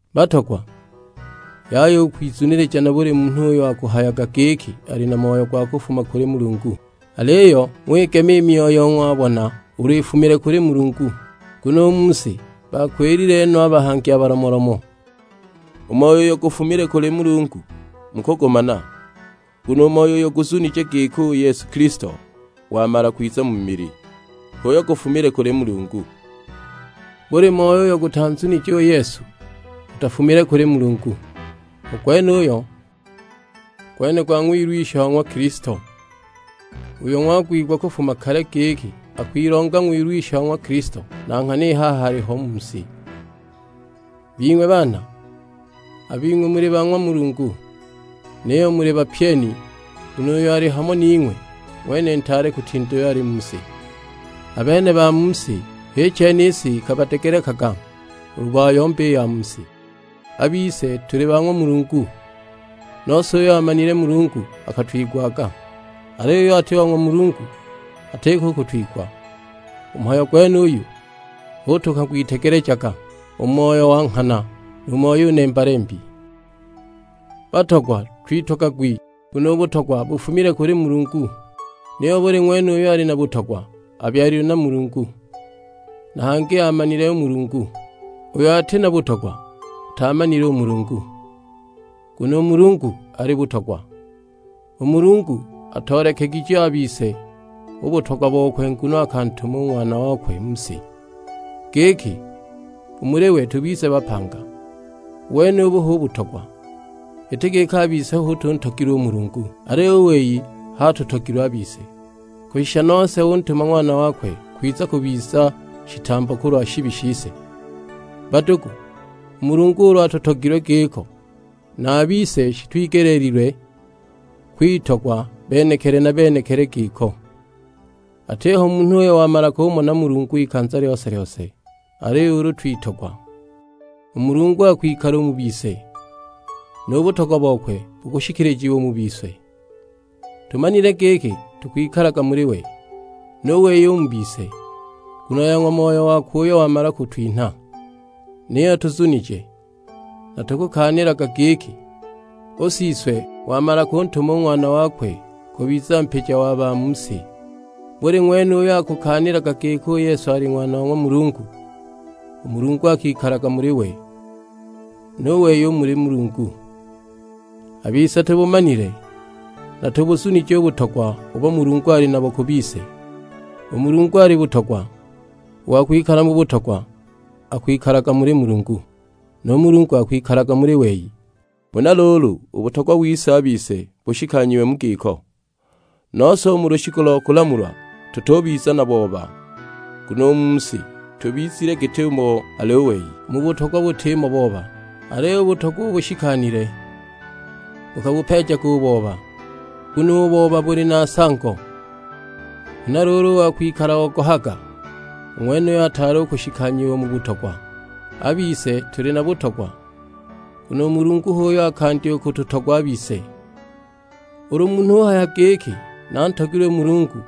Batogwa, yaya u kwizunilija na buli munhu uyo akuhayaga giki ali na moyo gwa kufuma kuli Mulungu; aliyo ng'wigema i myoyo ng'wabona ulu ifumile kuli Mulungu. Nguno u mu si baakwilile no a bahangi a balomolomo. U moyo uyo gufumile kuli Mulungu mukugumana, nguno u moyo uyo guzunije giki u Yesu Kilisto wamala kwiza mu mili, h'uyo gufumile kuli Mulungu. Buli moyo uyo gutanzunije u Yesu gutafumile kuli Mulungu; u gwenuyo gwene gwa Ng'wilwisha wa ng'wa Kilisto, uyo ng'wang'wigwa kufuma kale giki akwilonga Ng'wilwisha wa ng'wa Kilisto, na nghana i haha aliho u mu si. Bing'we baana, a bing'we muli ba ng'wa Mulungu; niyo muli bapyeni nguno uyo ali hamo ning'we ng'wene ntaale kutinda uyo ali mu si. A bene ba mu si, h'i chene i si ikabadegelekaga, ulu bayomba i ya mu si. A bise tuli ba ng'wa Mulungu; nose uyo aamanile Mulungu akatwigwaga, aliyo uyo ati wa ng'wa Mulungu atiko u kutwigwa! U mu mhayo gwenuyu hu tukang'witegelejaga u Moyo wa nghana, nu moyo u nemba-lembi. Batogwa twitogagwi, nguno u butogwa bufumile kuli Mulungu. Niyo buli ng'wene uyo ali na butogwa abyalilwe na Mulungu, na hangi aamanile u Mulungu. Uyo ati na butogwa ataamanile u Mulungu, nguno u Mulungu ali butogwa. U Mulungu atoolekegije a bise u butogwa bokwe nguno akantuma u Ng'wana wakwe mu si, giki u muli we tubize bapanga. U wenubu hu butogwa, iti giki a bise hu tuntogilwe u Mulungu, aliyo u wei h'atutogilwe a bise; kushisha nose untuma Ng'wana wakwe kwiza kubiza shitambo kulwa shibi shise. Badugu, u Mulungu ulu atutogilwe giko, na a bise shitwigelilwe kwitogwa benekili na benekili giko. Atiho munhu uyo wamala kumona Mulungu ikanza lyose-lyose, aliyo ulu twitogwa, u Mulungu akwikala u mu bise; nu butogwa bokwe bukushikilijiwa u mu bise. Tumanile giki tukwikalaga muli we, nu wei u mu bise, nguno ya ng'wa Moyo wakwe uyo wamala kutwinha. Niyo tuzunije, na tukukaanilaga giki, u Siswe wamala kuntuma u Ng'wana wakwe kubiza Mpija wa ba mu si. Buli ng'wene uyo akukaanilaga giki u Yesu ali Ng'wana wa ng'wa Mulungu, u Mulungu akikalaga muli we, nu wei u muli Mulungu. A bise tubumanile, na tubuzunije u butogwa ubo Mulungu ali nabo ku bise. U Mulungu ali butogwa. U wa kwikala mu butogwa akwikalaga muli Mulungu; nu Mulungu akwikalaga muli we. Huna luulu u butogwa wise a bise bushikanyiwe mu giko; nose u mu lushiku lo kulamulwa tutubiza na booba, nguno u mu si tubizile git'umo ali u wei. U mu butogwa butimo booba, aliyo u butogwa ubo bushikanile bukabupeejaga u booba, nguno u booba buli na nsango, huna luulu u wa kwikala ogohaga, u ng'wenuyo ataali u kushikanyiwa u mu butogwa. A bise tuli na butogwa, nguno u Mulungu h'uyo akandya u kututogwa a bise. Ulu munhu uhaya giki, "Nantogilwe u Mulungu;"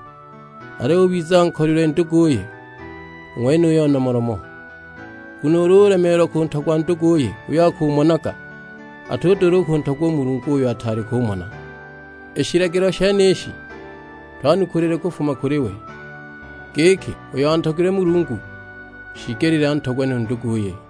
aliyo ubiza ankolilwe nduguye, u ng'wenuyo nomolomo. Nguno ulu ulemeelwa kuntogwa nduguye uyo akumonaga, atudula u kuntogwa u Mulungu uyo ataali kumona. I shilagilo shenishi twanukulile kufuma kuli we, giki uyo antogilwe Mulungu shiigelile antogwe nu nduguye.